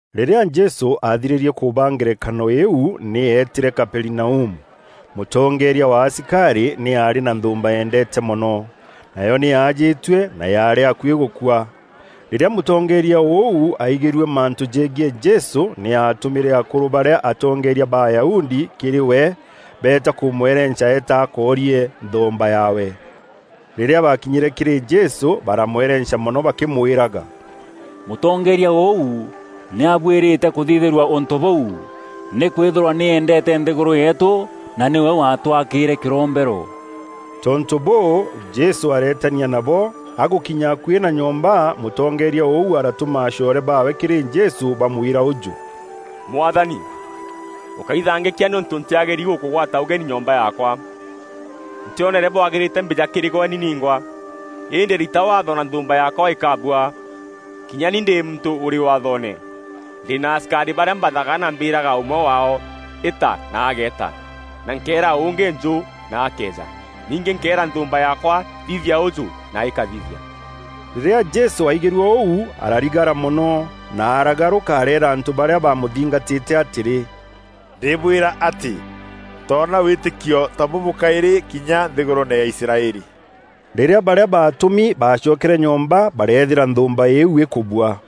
Rîrîa Jesû athirîrie kûbaa ngerekano iu nî eetîre Kaperinaumu. Mûtongeeria wa asikarî, nî aarî na nthûûmba eendeete mono. Nayo nî yaajîtue na yaarî akuî gûkua. Rîrîa mûtongeeria ûu aigîrue mantû jegiî Jesû, nî aatûmîre akûrû barîa atongeeria ba Ayahudi kîrî we beeta kûmwerenca eete akoorie nthûûmba yaawe. Rîrîa baakinyîre kîrî Jesû baramwerenca mono bakîmwîraga, “Mûtongeeria ûu nî abuîrîte kûthithîrua ûntû bûu, nîkwîthîrwa nî eendeete nthîgûrû yeetû, na nîwe waatwakîîre kîrombero.” Tontû bûû, Jesû areetania nabo. Agûkinya akuî na nyomba, mûtongeeria ûu aratûma acoore baawe kîrî Jesû bamwîra ûjû, “Mwathani, ûkaithangîkia nîûntû ntîagîri gûkûgwata ûgeni nyomba yaakwa. Ntîonere bwagîrîte mbîja kîrî gwe ni ningwa. Îndî rita waatho na nthûûmba yaakwa îkabua. Kinya ni ndî muntû ûrî waathoone. Ndî na asikarî barîa mbathaga na mbîîraga ûmwe waao, ‘Îta!’ Na ageeta; na nkeera ûngî, ‘Njû!’ Na akeeja. Ningî nkeera nthûûmba yaakwa, ‘Thithia ûjû!’ Na îkathithia.” Rîrîa Jesû aigîrue ûu ararigara mono na aragarûka areera antû barîa bamûthingatîte atîrî, “Ndîbwîra atî, ntoona wîîtîkio ta bûbû kaîrî kinya nthîgûrûûne ya Israeli.” Rîrîa barîa baatûmi baacokere nyomba barethîra nthûûmba iu îkubua.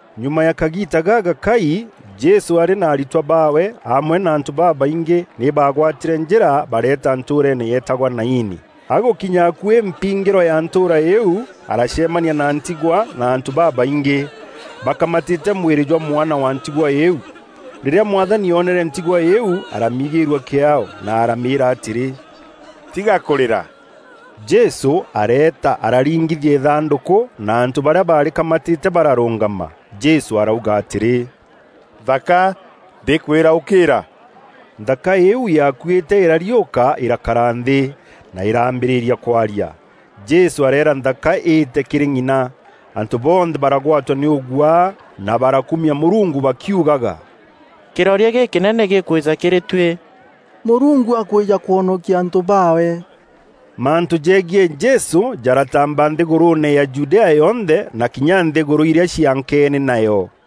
Nyuma ya kagiita gagakai, Jesû arî na aritwa baawe amwe na antû babaingî nî baagwatîre njîra bareeta ntûûreene yeetagwa Naini. Agûkinya akuî mpingîro ya ntûûra iu, aracemania na ntigwa na antû babaingî bakamatîte mwîrî jwa mwana wa ntigwa îîu. Rîrîa Mwathani oonere ntigwa îîu aramiigîîrua kîaao, na aramîîra atîrî, “Tiga kûrîra.” Jesû areeta araringithia îthandûkû, na antû barîa baarîkamatîte bararûngama. Jesû arauga atîrî, “Nthaka, ndîkwîra ûkîîra!” Nthaka îîu yaakuîte îrariûka îrakara nthî, na îraambîrîria kwaria. Jesû areera nthaka îte kîrî ng'ina. Antû bonthe baragwatwa nî ûguaa, na barakumia Mûrungu bakiugaga, “Kîroria gîkînene gîkwîja kîrî tuî. Mûrungu akwîja kwonokia antû baawe!” Mantû jegiî Jesû jaratamba nthîgûrûûne ya Judea yonthe na kinya nthîgûrû irîa ciaankeene nayo.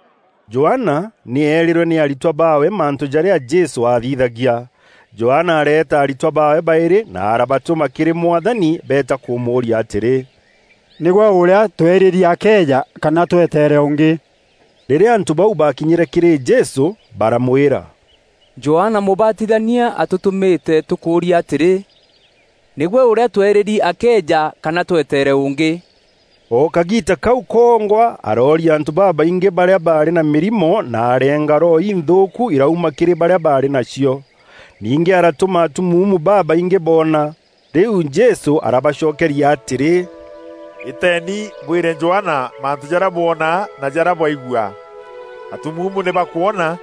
Johana nî eerîrwe nî aritwa baawe mantû jarîa Jesû aathithagia. Johana areeta aritwa baawe baîrî na arabatûma kîrî Mwathani, beeta kûmûûria atîrî, “Nîgwe ûrîa tweerîri akeeja kana tweteere ûngî.” Rîrîa antû bau baakinyîre kîrî Jesû, baramwîra, “Johana Mûbatithania atûtûmîte tûkûûria atîrî, ‘Nîgwe ûrîa tweerîri akeeja kana tweteere ûngî?’” O kagiita kau kongwa arooria antû babaingî barîa baarî na mîrimo na arenga roho inthûûku irauma kîrî barîa baarî nacio. Ningî aratûma atumuumu babaingî boona. Rîu Jesû arabacokeria atîrî, “Îteeni bwîre Johana mantû jarîa bwona na jarîa bwaigua: atumuumu nî bakwona;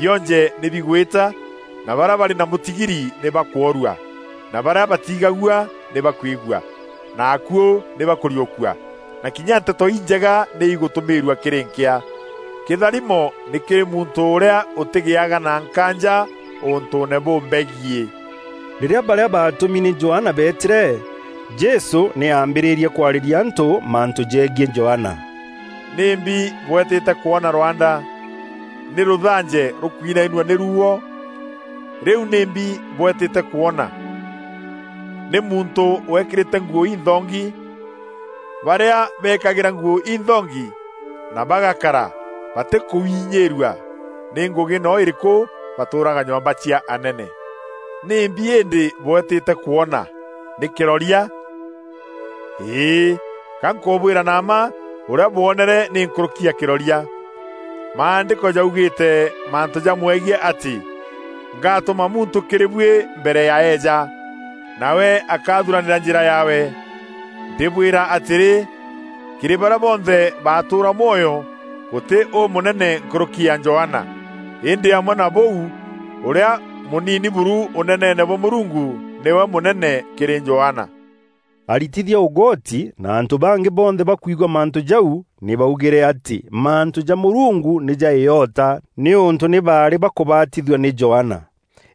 bionje nî bigwîta, na barîa barî na mûtigiri nî bakwoorua, na barîa batiigagua nî bakwigua, na akuû nî bakûriûkua, na kinya Nteto Injega nî îgûtûmîîrua kîrî nkîa. Kîtharimo nî kîrî muntû ûrîa ûtîgiaga na nkaanja ûntûûne bûmbegiî.” Rîrîa barîa baatûmi nî Johana beetîre, Jesû nî aambîrîrie kwarîria antû mantû jegiî Johana: “Nîmbi bwetîte kwona rwanda? Nî rûthanje rûkwinainua nî ruuo? Rîu nîmbi bweetîte kwona? Nî muntû weekîrîte nguû inthongi? Barîa bekagîra nguû inthongi na bagakara batîkwûinyîrua nî ngûgî no îrîkû batûûraga nyomba cia anene. Nîmbi îndî bweetîte kwona? Nî kîroria? Îî, ga nkûbwîra na mma ûrîa bwoonere nî nkûrûki ya kîroria. Maandîko jaugîîte mantû jamwegiî atî, ‘Ngatûma muntû kîrî buî mbere ya eeja, nawe akathuranîra njîra yaawe.’ Ndîbwîra atîrî, kîrî barîa bonthe batûûra mwoyo, gûtî ûmûnene nkûrûki ya Johana; îndî amwe na bûu, ûrîa mûnini buru Ûneneene bwa Mûrungu nîwe mûnene kîrî Johana.” Aritithia ûgoti na antû bangî bonthe bakwigua mantû jau, nî baugîre atî mantû ja Mûrungu nî ja îota, nîûntû nî baarî bakûbatithua nî Johana.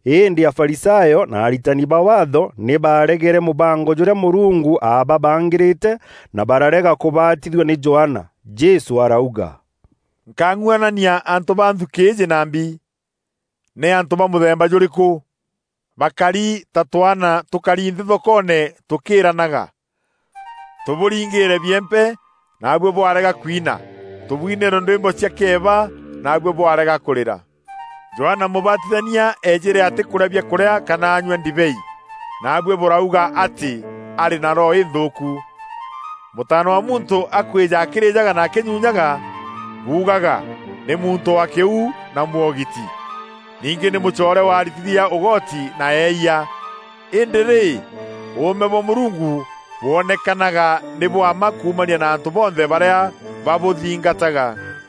Îndî Afarisayo na aritani ba Waatho nî baaregere mûbango jûrîa Mûrungu aababangîrîte, na bararega kûbatithua nî Johana. Jesû arauga, “Nkang'uanania antû ba nthukî îîjî na mbi? Nî antû ba mûthemba jûrîkû? Bakari ta twaana tûkari nthî thokoone tûkîîranaga, ‘Tûbûringîre biempe, naabuî bwarega kwina; tûbwinîîre ndwîmbo cia kîeba, naabuî bwarega kurira.’ Johana Mûbatithania eejîre atîkûrîa biakûrîa kana anyua ndibei; naabuî bûrauga atî, ‘Arî na roho înthûûku.’ Mûtaana wa Muntû akwîja akîrajaga na akînyunyaga, buugaga, ‘Nî muntû wa kîu na mwogiti. Ningî nî mûcoore wa aritithia ûgoti na eeyia!’ Îndî rî, ûûme bwa Mûrungu bûonekanaga nî bwa mma kuumania na antû bonthe barîa babûthingataga.”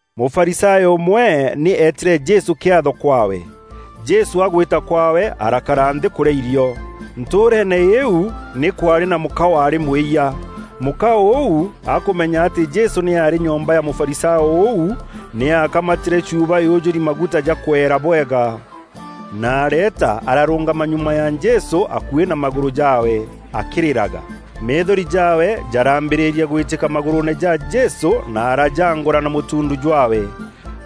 Mûfarisayo ûmwe nî eetîre Jesû kiatho kwaawe. Jesû agwîta kwaawe, arakara nthî kûrîa irio. Ntûûreene îîu nî kwaarî na mûka waarî mwîyia. Mûka ûu akûmenya atî Jesû nî arî nyomba ya Mûfarisayo ûu, nî aakamatîre chuuba yûjûri maguta jakweera bwega, na areeta ararûngama nyuma ya Jesû, akuî na magûrû jaawe, akîrîraga. Meethori jaawe jarambîrîria gwîtîka magûrûûne ja Jesû na arajaangûra na mûtuundu jwaawe.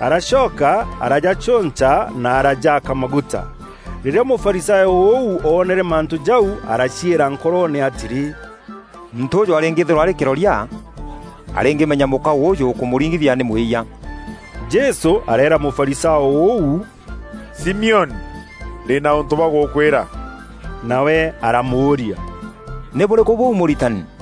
Aracoka arajacûnca na arajaaka maguta. Rîrîa Mûfarisayo ûu, oonere mantû jau, araciîra nkoroone atîrî, “Muntû ûûjû arîngîîthîrwa arî kîroria, arîngîmenya mûka ûûjû ûkûmûringithia nî mwîyia.” Jesû areera Mûfarisayo ûu, “Simioni, ndî na ûntû bwa gûkwîra.” Nawe aramûûria, “Nî bûrîkû bûu Mûritani?”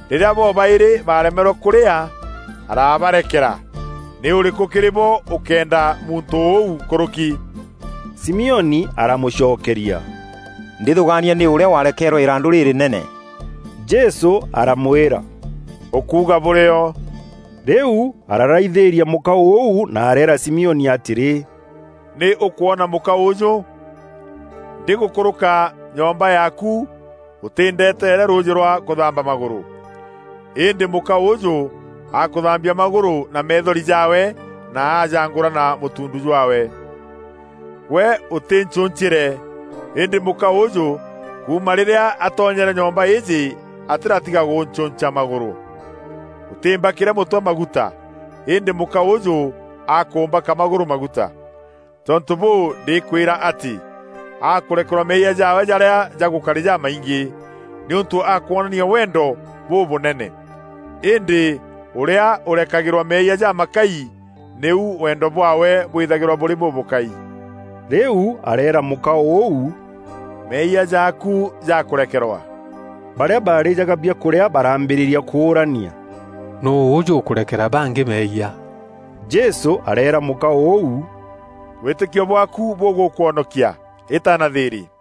Rîrîa bobaîrî baaremerwe kûrîaa, arabarekera. Nî ûrîkû kîrî bo ûkeenda muntû ûu nkûrûki?” Simioni aramûcokeria, “Ndîthûûgania nî ûrîa waarekeerwe îrandû rîrînene.” Jesû aramwîra, “Ûkuuga bûrîo.” Rîu araraithîria mûka ûu na areera Simioni atîrî, “Nî ûkwona mûka ûûjû? Ndîgûkûrûka nyomba yaaku ûtîndeeteere rûûjî rwa kûthamba magûrû. Îndî mûka ûûjû akûthambia magûrû na meethori jaawe na ajangûra na mûtuundu jwaawe. Gwe ûtîncuncîre, îndî mûka ûûjû kuuma rîrîa atonyere nyomba îîjî atîratiga gûncûnca magûrû. Ûtîmbakîre mûtwe maguta, îndî mûka ûûjû akûmbaka magûrû maguta. Tontû bûû, ndîkwîra atî, akûrekerwa meeyia jaawe jarîa jagûkarî jamaingî, nîûntû akwonania wendo bûbûnene. Îndî ûrîa ûrekagîrwa meeyia jamakai, nîu wendo bwaawe bwîthagîrwa bûrî bûbûkai.” Rîu areera mûka ûu, “Meeyia jaaku jakûrekerwa.” Barîa baarîjaga biakûrîa baraambîrîria kûûrania, “Nûû ûjû ûkûrekera bangî meeyia?” Jesû areera mûka ûu, “Wîîtîkio bwaaku bûgûkwonokia; îta na thîîrî.”